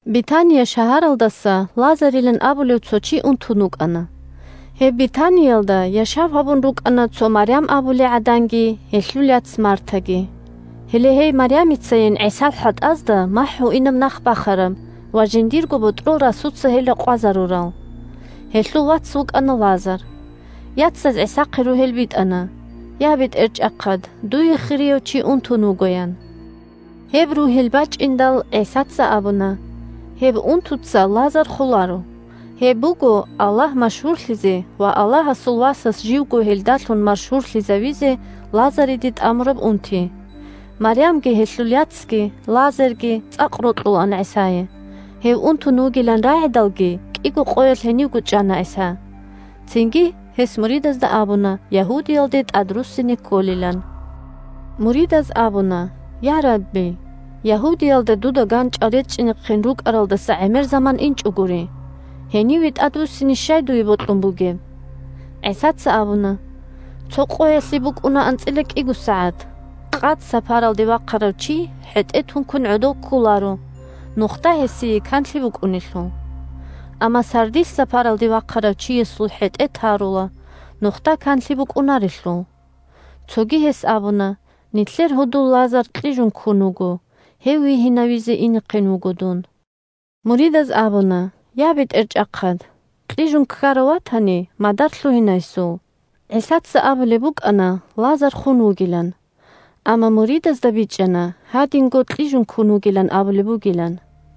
Бетания шагьаралдаса Лазарилан абулев цо чи унтун вукӀана. Гьеб Бетаниялда яшав гьабун рукӀана цо Марям абулей гӀаданги гьелъул яц Мартаги. Гьеле гьей Марямицайин ГӀисал хӀатӀазда махӀ гьуинаб нах бахараб ва жиндирго ботӀрол расуца гьел ракъвазарурал. Гьелъул вац вукӀана Лазар. Яцаз ГӀисахъе ругьел битӀана: «Я, БетӀерчӀахъад, дуе хирияв чи унтун вуго», – ян. Гьеб ругьел бачӀиндал, ГӀисаца абуна: – Гьеб унтуца Лазар холаро. Гьеб буго Аллагь машгьурлъизе ва Аллагьасул Васас живго гьелдалъун машгьурлъизавизе Лазариде тӀамураб унти. Марямги, гьелъул яцги, Лазарги цӀакъ рокьулаан ГӀисае. Гьев унтун вугилан рагӀидалги, кӀиго къоялъ гьенивго чӀана ГӀиса. Цинги гьес муридазда абуна Ягьудиялде тӀадруссине кколилан. Муридаз абуна: – Я, Рабби, Ягьудиялда дуда ганчӀал речӀчӀизехъин рукӀаралдаса гӀемер заман инчӀогури. Гьениве тӀадвуссине щай дуе бокьун бугеб? ГӀисаца абуна: – Цо къоялъе букӀуна анцӀила кӀиго сагӀат. Къад сапаралде вахъарав чи хӀетӀе тункун гӀодов кколаро, нухда гьесие канлъи букӀунелъул. Амма сардилъ сапаралде вахъарав чиясул хӀетӀе тарула, нухда канлъи букӀунарелъул. Цоги гьес абуна: – Нилъер гьудул Лазар кьижун ккун вуго. Гьев вигьинавизе инехъин вуго дун. Муридаз абуна: – Я, БетӀерчӀахъад, кьижун ккарав ватани, мадар лъугьина гьесул. ГӀисаца абулеб букӀана Лазар хун вугилан, амма муридазда бичӀчӀана гьадинго кьижун ккун вугилан абулеб бугилан.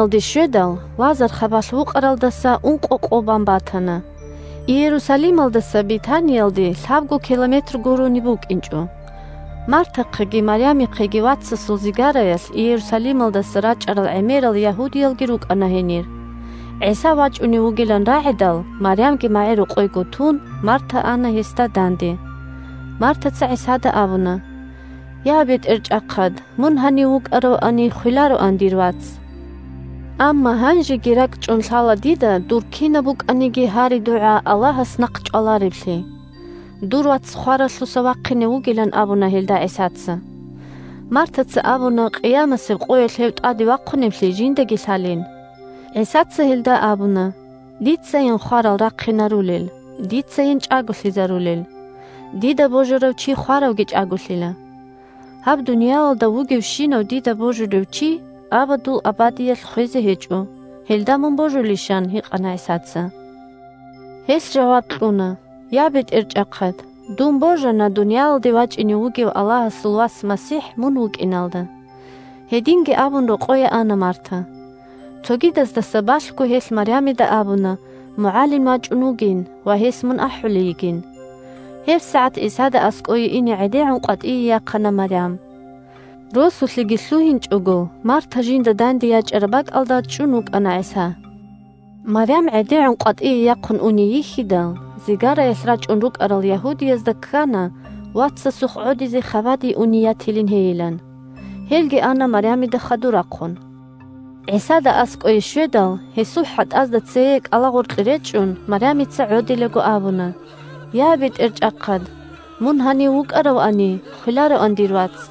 ГӀиса Бетаниялде щведал, Лазар хабалъ вукъаралдаса ункъо къо бан батана. Иерусалималдаса Бетаниялде лъабго километр гурони букӀинчӀо. Мартахъеги Марямихъеги вацасул зигараялъ Иерусалималдаса рачӀарал гӀемерал ягьудиялги рукӀана гьенир. ГӀиса вачӀунев вугилан рагӀидал, Марямги магӀирокъойго тун, Марта ана гьесда данде. Мартаца ГӀисада абуна: – Я, БетӀерчӀахъад, мун гьанив вукӀаравани, хвелароан дир вац! Амма гьанжеги ракӀчӀун лъала дида дур кинаб букӀаниги гьари-дугӀа Аллагьас нахъчӀвалареблъи. Дур вац хваралъуса вахъине вугилан абуна гьелда ГӀисаца. Мартаца абуна къиямасеб къоялъ гьев тӀаде вахъуневлъи жиндаги лъалин. ГӀисаца гьелда абуна: – Дицайин хварал рахъинарулел, дицайин чӀаголъизарулел. Дида божарав чи хваравги чӀаголъила. Гьаб дуниялалда вугевщинав дида божулев чи абадул абадиялъ хвезе гьечӀо. Гьелда мун божулищ? – ан гьикъана ГӀисаца. Гьелъ жаваб кьуна: – Я, БетӀерчӀахъад, дун божана дуниялалде вачӀине вугев Аллагьасул Вас МасихӀ мун вукӀиналда. Гьединги абун, рокъое ана Марта. Цогидаздаса балъго гьелъ Марямида абуна МугӀалим вачӀун вугин ва гьес мун ахӀулей йигин. ГьебсагӀат ГӀисада аскӀое ине гӀедегӀун къватӀие яхъана Марям. Росулъеги лъугьинчӀого, Марта жинда данде ячӀараб бакӀалда чӀун вукӀана ГӀиса. Марям гӀедегӀун къватӀие яхъун уней йихьидал, зигараялъ рачӀун рукӀарал ягьудиязда ккана вацасухъ гӀодизе хабаде уней ятилин гьейилан. Гьелги ана Марямида хадур рахъун. ГӀисада аскӀое щведал, гьесул хӀатӀазда цее кӀалагъоркье речӀчӀун, Марямица гӀодилаго абуна: – Я, БетӀерчӀахъад, мун гьанив вукӀаравани, хвелароан дир вац!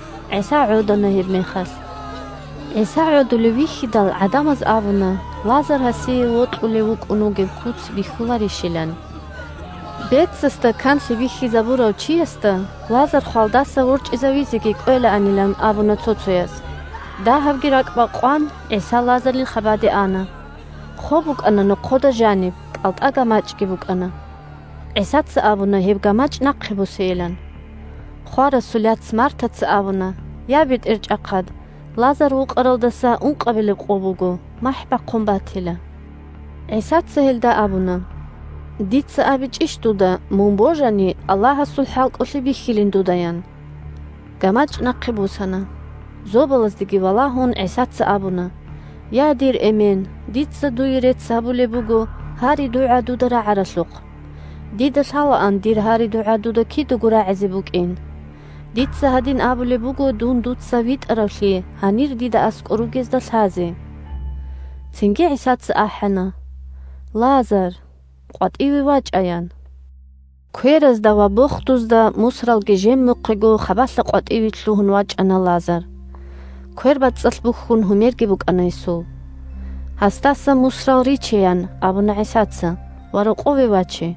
ГӀиса гӀодана гьебмехалъ. ГӀиса гӀодулев вихьидал, гӀадамаз абуна Лазар гьасие вокьулев вукӀун вугеб куц бихьуларищилан. Бецасда канлъи бихьизабурав чиясда Лазар хвалдаса ворчӀизавизеги кӀвелаанилан абуна цо-цояз. Дагьабги ракӀбакъван, ГӀиса Лазарил хабаде ана. Хоб букӀана нохъода жаниб, кӀалтӀа гамачӀги букӀана. ГӀисаца абуна гьеб гамачӀ нахъе босейилан. Хварасул яц Мартаца абуна: – Я, БетӀерчӀахъад, Лазар вукъаралдаса ункъабилеб къо буго, махӀ бахъун батила. ГӀисаца гьелда абуна: – Дица абичӀищ дуда, мун божани, Аллагьасул хӀалкӀолъи бихьилин дудаян. ГамачӀ нахъе босана. Зобалаздеги валагьун, ГӀисаца абуна: – Я, дир Эмен, дица дуе рецц гьабулеб буго гьари-дугӀа дуда рагӀаралъухъ. Дида лъалаан дир гьари-дугӀа дуда кидаго рагӀизе букӀин. Дица гьадин абулеб буго дун дуца витӀаравлъи гьанир дида аскӀор ругезда лъазе. Цинги ГӀисаца ахӀана: – Лазар! КъватӀиве вачӀа! – ян. Кверазда ва бохдузда мусралги жемухъего хабалъа къватӀиве лъугьун вачӀана Лазар. КвербацӀцӀалъ бухьун гьумерги букӀана гьесул. – Гьасдаса мусрал риче, – ян абуна ГӀисаца, – ва рокъове ваче.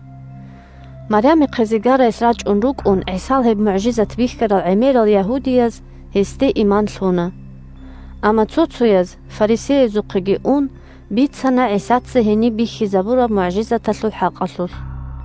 Марямихъе зигараялъ рачӀун рукӀун ГӀисал гьеб мугӀжизат бихьарал гӀемерал ягьудияз гьесде иман лъуна. Амма цо-цояз, фарисеязухъе ун, бицана ГӀисаца гьениб бихьизабураб мугӀжизаталъул хӀакъалъулъ.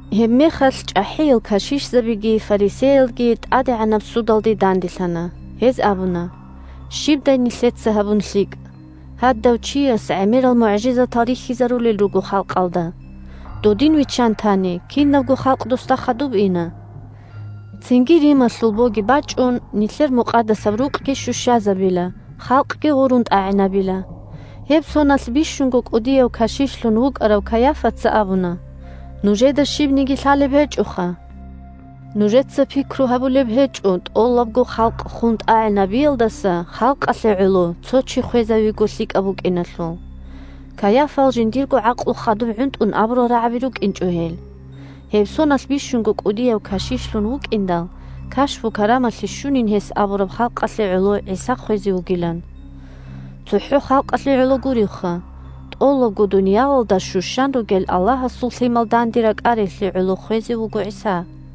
Гьебмехалъ чӀахӀиял кашишзабиги фарисеялги тӀадегӀанаб судалъе данделъана. Гьез абуна: – Щибдай нилъеца гьабун лъикӀ? Гьадав чияс гӀемерал мугӀжизатал рихьизарулел руго халкъалда. Додин виччан тани, кинабго халкъ досда хадуб ина. Цинги Рималъул боги бачӀун, нилъер Мукъадасаб Рукъги щущазабила, халкъги гъурун тӀагӀинабила. Гьеб соналъ бищунго кӀудияв кашишлъун вукӀарав Кайафаца абуна: – Нужеда щибниги лъалеб гьечӀоха. Нужеца пикру гьабулеб гьечӀо тӀолабго халкъ хун тӀагӀинабиялдаса халкъалъе гӀоло цо чи хвезавиго лъикӀаб букӀиналъул. Кайафал жиндирго гӀакълу хадуб гӀунтӀун абурал рагӀаби рукӀинчӀо гьел. Гьеб соналъ бищунго кӀудияв кашишлъун вукӀиндал, кашпу-карамалъи щунин гьес абураб халкъалъе гӀоло ГӀиса хвезе вугилан. ЦохӀо халкъалъе гӀоло гуревха. ТӀолабго дуниялалда щущан ругел Аллагьасул лъимал данде ракӀариялъе гӀоло хвезе вуго ГӀиса.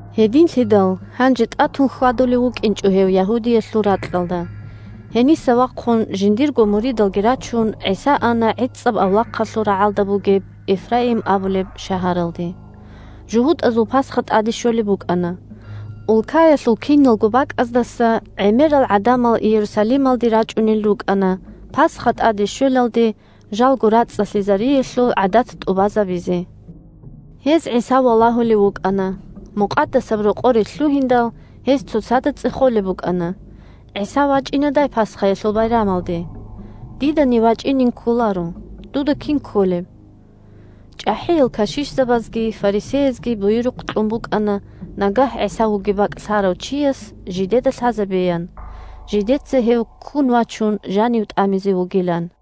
Гьединлъидал гьанже тӀатун хьвадулев вукӀинчӀо гьев Ягьудиялъул ракьалда. Гьениса вахъун, жиндирго муридалги рачун, ГӀиса ана гӀицӀаб авлахъалъул рагӀалда бугеб Эфраим абулеб шагьаралде. ЖугьутӀазул Пасха тӀаде щолеб букӀана. Улкаялъул киналго бакӀаздаса гӀемерал гӀадамал Иерусалималде рачӀунел рукӀана Пасха тӀаде щвелалде жалго рацӀцӀалъизариялъул гӀадат тӀубазабизе. Гьез ГӀиса валагьулев вукӀана. Мукъадасаб Рокъоре лъугьиндал, гьез цоцазда цӀехолеб букӀана: – ГӀиса вачӀинадай Пасхаялъул байрамалде? Дидани вачӀинин кколаро. Дуда кин кколеб? ЧӀахӀиял кашишзабазги фарисеязги буюрухъ кьун букӀана нагагь ГӀиса вугеб бакӀ лъарав чияс жидеда лъазабеян, жидеца гьев, ккун вачун, жанив тӀамизе вугилан.